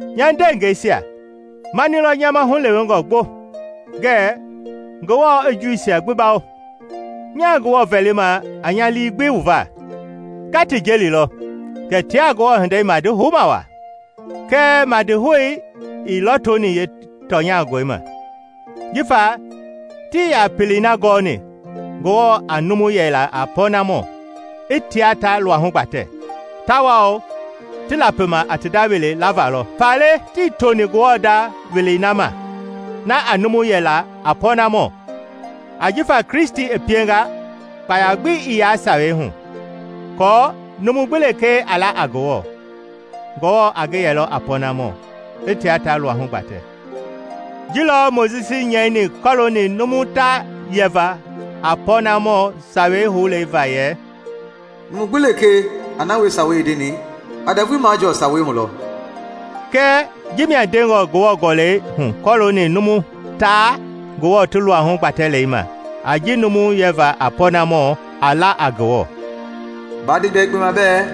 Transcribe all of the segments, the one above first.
Nya ndeengɛisia, mani lɔ nya ma hulewengɔ gbo ngɛɛ Ngewɔ i Juuisia gbi bawo. Nyaa Ngewɔ vɛlima a nya lii gbi wu va. Nga ti jelilɔ kɛ tia Ngewɔ hindei madi houma waa, kɛɛ madihoui ii lɔtoni yeetɔnyangɔi ma. Jifa tii yaa pelei na gɔɔni Ngewɔ a numu yɛ la a pɔnamɔ, i tia ta luahu gbatɛ, tawao ti lapima a ti nda wele lavalɔ; faale tii toni Ngewɔ nda welei na ma na a numu yɛ la a pɔnamɔ. Ajifa Kristi i pienga kpaya gbi ii yaa Sawei hu, aako numu gbi lekee a la a Ngewɔ, Ngewɔ a ngi yɛlɔ a pɔnamɔ, i tia ta luahu gbatɛ. Ji lɔ Mojisi nyɛini kɔlooni numu taa yɛva a pɔɔnamɔ sawei houlei va yɛ, “Numu gbi lekee a na wie Sawei i ndeni, a ndɛvui majɔɔ Sawei hu lɔ.” Kɛɛ jimia ndengɔ Ngewɔ gɔlɛi hu kɔlooni numu taa Ngewɔ ti luahu gbatɛlɛi ma a ji numu yɛva a pɔɔnamɔ a la a Ngewɔ: “Baa nde bia yekpe ma bɛɛ,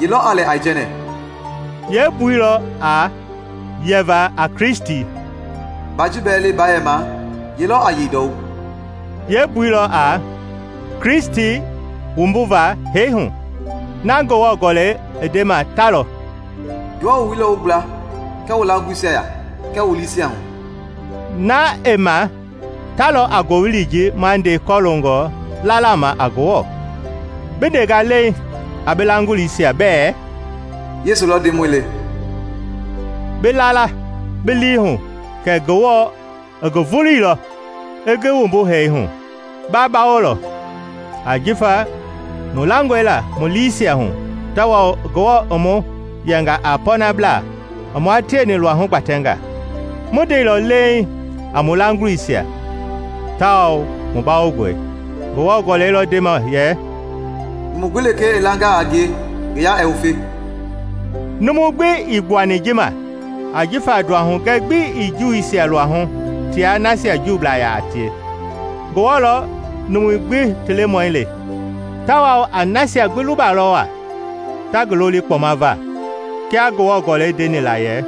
Ye lɔ a lɛ aijɛnɛ?” (yeembui lɔ a, yeeva a Kristi.) “Baa ji bɛɛ le baa yɛma, Ye lɔ a yei ndɔwu?” (yeembui lɔ a, Kristi wumbuva hee hu.) Na Ngewɔ Gɔlɛi i ndema ta lɔ: “Ngewɔ wooyili lɔ wu gbla kɛɛ wu laagulisia ya kɛɛ wu lii hu” na i ma ta lɔ a ngowili ji ma nde kɔloongɔ lala ma a Ngewɔ. Bi ndengaa leiŋ a bi laagulisia bɛɛ “Yesu lɔ Ndemɔi le,” bi la la bi lii hu kɛ Ngewɔ i ngi vuluilɔ i ngi wumbu hee hu, ba bawolɔ. Ajifa mu langɔe la mu liisia hu tawao Ngewɔ i mu yɛnga a pɔɔnablaa i mua tieni luahu gbatɛnga; mu ndeilɔ leiŋ a mu laagulisia tawao mu bawongɔe. Ngewɔ Gɔlɛi lɔ ndema yɛ, “Numu gbi lekee i langaa a ngie ngi yaa ɛɛ wufe.” Numu gbi ii gbuani ji ma ajifa nduahugɛ gbi ii Juuisia luahu tia nasia Juublaa yaa tie; Ngewɔ lɔ numui gbi ti Lemɔi le, tawao a nasia gbi lubalɔ waa ta ngi loli kpɔma va. Kia Ngewɔ Gɔlɛi ndeni la yɛ,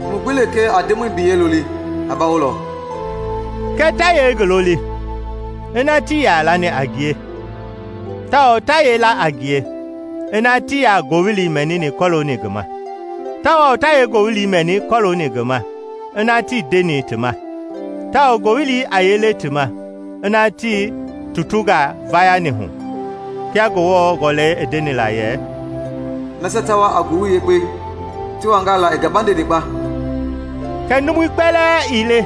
“Numu gbi lekee a Ndemɔi biyɛi loli, a bawolɔ.” Kɛɛ ta yee ngi loli, ina tii yaa lani a ngie? Tawao ta yee la a ngie ina tii yaa ngowili mɛnini kɔlooni ngi ma? Tawao ta yee ngowili mɛni kɔɔlooni ngi ma ina tii ndeni ti ma? Tawao ngowili a yee le ti ma ina tii tutungaa vayani hu? Kia Ngewɔ Gɔlɛi i ndeni la yɛ, “Nasia ta wa a ngowili yekpe, ti wangaa la i gabandeni kpa!” Kɛɛ numui kpɛlɛɛ ii le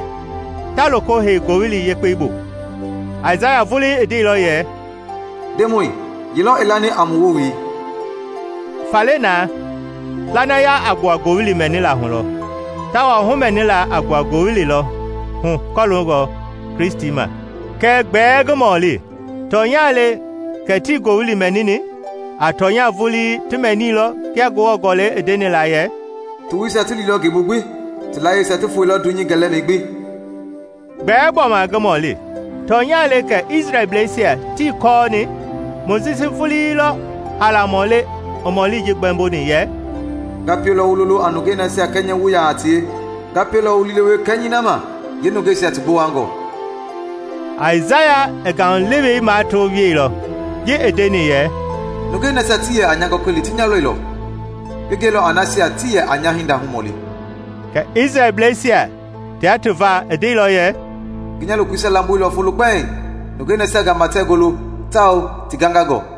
taa loko hei Ngowili Yekpei bu. Aisaya vulii i ndeilɔ yɛ, “Ndemɔi, ye lɔ i lani a mu wowili?” Faale na, lanaya a gbua ngowili mɛnila hu lɔ, tawao humɛnila a gbua ngowili lɔ hu kɔlooni Kristi ma. Kɛɛ gbɛɛ ngi mɔli, tɔnya le kɛ tii ngowili mɛnini? A tɔnya vulii ti mɛniilɔ kia Ngewɔ Gɔlɛi i ndeni la yɛ: “Ti woisia ti liilɔ ngeebu gbi; ti layieisia ti foeilɔ dunyei gɛlɛmɛi gbi.” Gbɛɛ gbɔma ngi mɔli, tɔnya le kɛ Isrɛlbleisia tii kɔɔni? Mojisi vulii lɔ haalamɔ le i mɔli ji gbɛmboni yɛ, “Nga pielɔ wu lolo a nungei nasia kɛnyɛwu yaa a tie; nga pielɔ wu liilewe kɛnyɛi na ma yeenungeisia ti gbowangɔ.” Aisaya i ngaulewei mato wieilɔ ji i ndeni yɛ, “Nungei nasia tii yɛ a nya gɔkɔli ti nya lɔilɔ, ngi gɛilɔ a nasia tii yɛ a nya hinda humɔli.” Kɛɛ Isrɛlbleisia tia ti va i ndeilɔ yɛ, “Ngi nya lokoisia lamboilɔ folo kpɛiŋ nungei nasia gama tɛɛ golo tawao ti gangangɔ.”